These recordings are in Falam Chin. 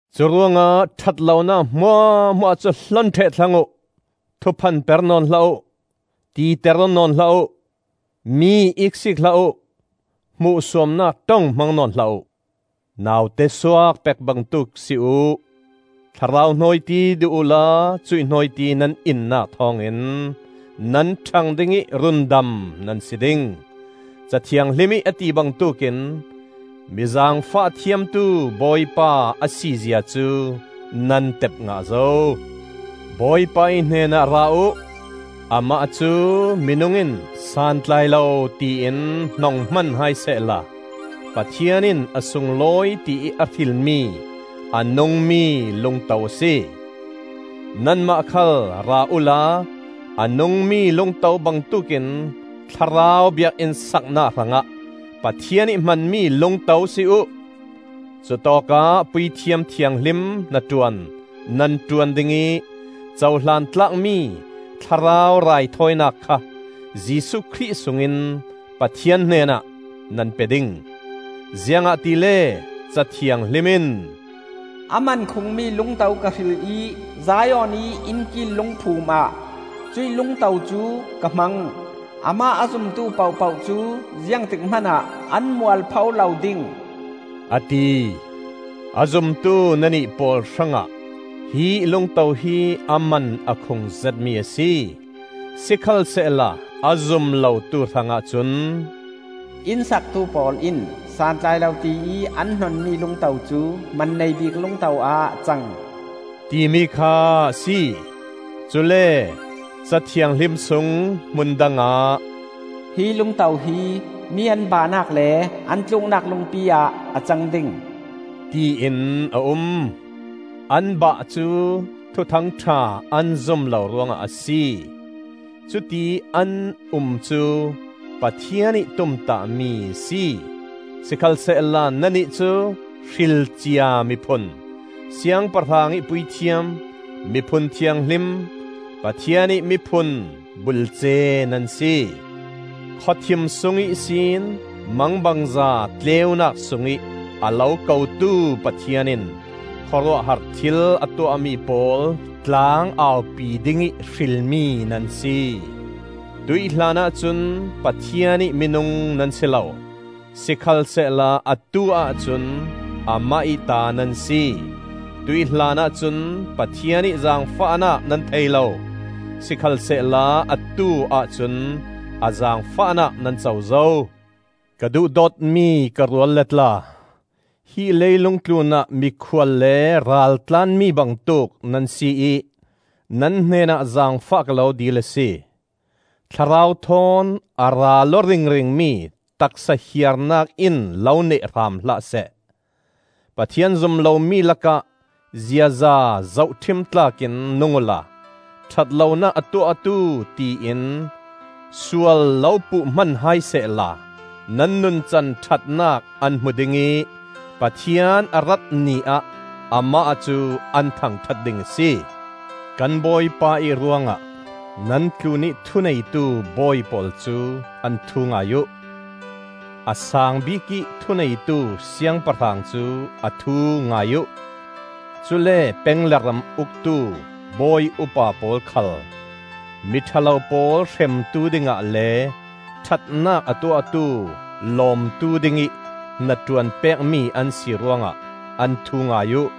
Curuangah ṭhat lonak hmuahhmuah cu hlon ṭheh thlang uh; thuphan per nawn hlah uh; titer aw nawn hlah uh; mi iksiik hlah uh; hmuhsuamnak ṭong hmang nawn hlah uh. Naute suak pek bangtuk si uh; thlarau hnawiti duh uhla cuih hnawiti nan innak thawngin nan ṭhang ding ih rundam nan si ding. Ca Thianghlim ih a ti bangtuk in, “Mi zaangfah thiamtu Bawipa a si zia cu nan tep ngah zo.” Bawipa ih hnenah ra uh; amah cu minung in santlai lo tiin hnong hman hai sehla Pathian in a sunglawi tiih a hrilmi a nungmi Lungto a si. Nanmah khal ra uhla a nungmi lungto bangtuk in thlarau biakinn saknak hrangah Pathian ih hmanmi lungto si uh. Cutawkah puithiam thianghlim hnaṭuan nan ṭuan ding ih cohlan tlakmi thlarau raithawinak kha Jesuh Khrih sungin Pathian hnenah nan pe ding. Ziangahtile Ca Thianghlim in, “A man khungmi lungto ka hril ih, Zion ih innkil lungphumah cuih lungto cu ka hmang. Amah a zumtu pohpoh cu ziangtik hmanah an mualpho lo ding,” a ti. A zumtu nannih pawl hrangah hi lungto hi a man a khung zetmi a si. Sikhalsehla a zum lotu hrangah cun, “Inn saktu pawl in santlai lo tiih an hnonmi lungto cu man nei bik lungto-ah a cang,” timi kha a si. Cule Ca Thianghlim sung hmun dangah, “Hi lungto hi mi an bahnak le, an tluknak lungpi ah a cang ding,” tiin a um. An bah cu thuthang ṭha an zum lo ruangah a si; cuti an um cu Pathian ih tumtahmi a si. Sikhalsehla nannih cu hrilcia miphun, Siangpahrang ih puithiam, miphun thianghlim, Pathian ih miphun bulce nan si. Khawthim sung ihsin mangbangza tleunak sungih a lo kotu Pathian in khawruahhar thil a tuahmi pawl tlang-aupi dingih hrilmi nan si. Tuih hlanah cun Pathian ih minung nan si lo, sikhalsehla atu-ah cun amah ih ta nan si; tuih hlanah cun Pathian ih zaangfahnak nan thei lo; sikhalsehla atu-ah cun a zaangfahnak nan co zo. Ka duhdawtmi ka rualle tla, hi leilung tlunah mikhual le raltlaanmi bangtuk nan si ih nan hnenah zaangfah ka lo dil a si. Thlarau thawn a ral aw ringringmi taksa hiarnak in lo neh hram hlah seh. Pathian zum lomi lakah ziaza zohṭhim tlak in nung uhla ṭhat lonak a tuahtu tiin sual lo puh hman hai sehla, nan nuncan ṭhatnak an hmu ding ih Pathian a rat Ni ah amah cu an thangṭhat ding a si. Kan Bawipa ih ruangah nan tlunih thuneitu bawi pawl cu an thu ngai uh; a saang bikih thuneitu Siangpahrang cu a thu ngai uh. Cule peng le ram uktu bawi upa pawl khal, mi ṭha lo pawl hremtu dingah le ṭhatnak a tuahtu lawmtu dingih hnaṭuan pekmi an si ruangah an thu ngai uh.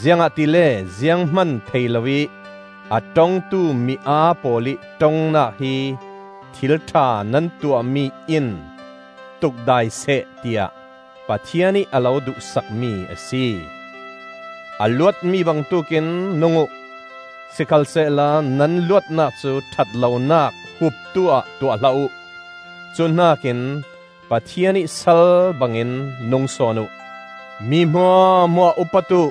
Ziangahtile ziang hman thei loih a ṭongtu mi aa pawl ih ṭongnak hi thil ṭha nan tuahmi in tukdai seh tiah Pathian ih a lo duhsakmi a si. A luatmi bangtuk in nung uh; sikhalsehla nan luatnak cu ṭhat lonak huptu-ah tuah hlah uh; cuhnakin Pathian ih sal bangin nung sawn uh. Mi hmuahhmuah upat uh,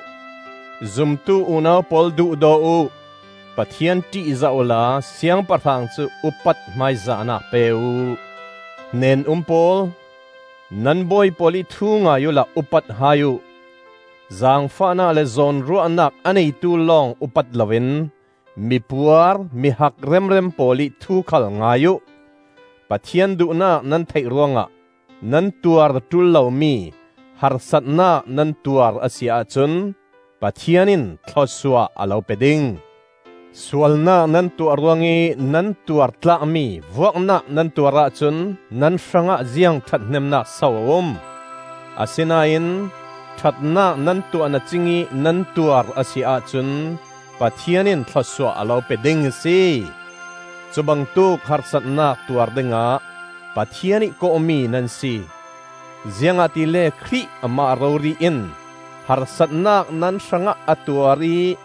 zumtu unau pawl duhdaw uh; Pathian ṭihzah uhla Siangpahrang cu upat hmaizahnak pe uh. Hnen-um pawl, nan bawi pawl ih thu ngai uhla upat hai uh; zaangfahnak le zawnruahnak a neitu lawng upat loin mipuar mihak remrem pawl ih thu khal ngai uh. Pathian duhnak nan theih ruangah nan tuar ṭul lomi harsatnak nan tuar a si ahcun Pathian in thlawsuah a lo pe ding. Sualnak nan tuah ruangih nan tuar tlakmi vuaknak nan tuar ahcun nan hrangah ziang ṭhathnemnak so a um? Asinain ṭhatnak nan tuah na cingih nan tuar a si ahcun Pathian in thlawsuah a lo pe ding a si. Cu bangtuk harsatnak tuar dingah Pathian ih kawhmi nan si; ziangahtile Khrih amah rori in harsatnak nan hrangah a tuar ih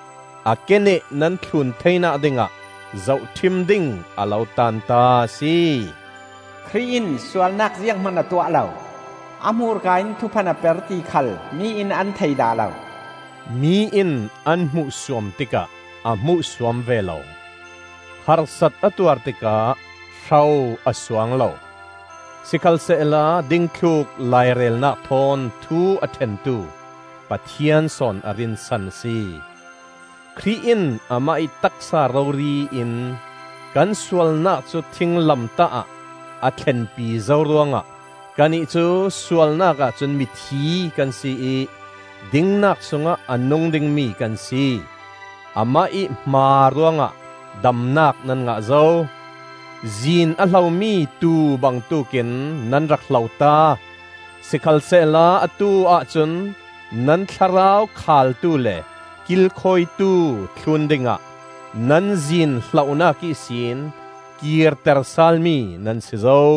a keneh nan thlun theinak dingah zohṭhim ding a lo taanta a si. Khrih in sualnak zianghman a tuah lo; a hmurka in thuphan a per ti khal mi in an thei dah lo. Mi in an hmuhsuam tikah a hmuhsuam ve lo; harsat a tuar tikah hro a suang lo. Sikhalsehla dingthluk lairelnak thawn thu a ṭhentu Pathian sawn a rinsan a si. Khrih in amah ih taksa rori in kan sualnak cu thinglamtah ah a thlenpi zo ruangah kannih cu sualnak ahcun mi thi kan si ih dingnak sungah a nung dingmi kan si. Amah ih hmaa ruangah damnak nan ngah zo. Zin a hlomi tuu bangtuk in nan rak hlota; sikhalsehla atu-ah cun nan thlarau Khaltu le Kilkhawitu thlun dingah nan zin hlohnak ihsin kirter salmi nan si zo.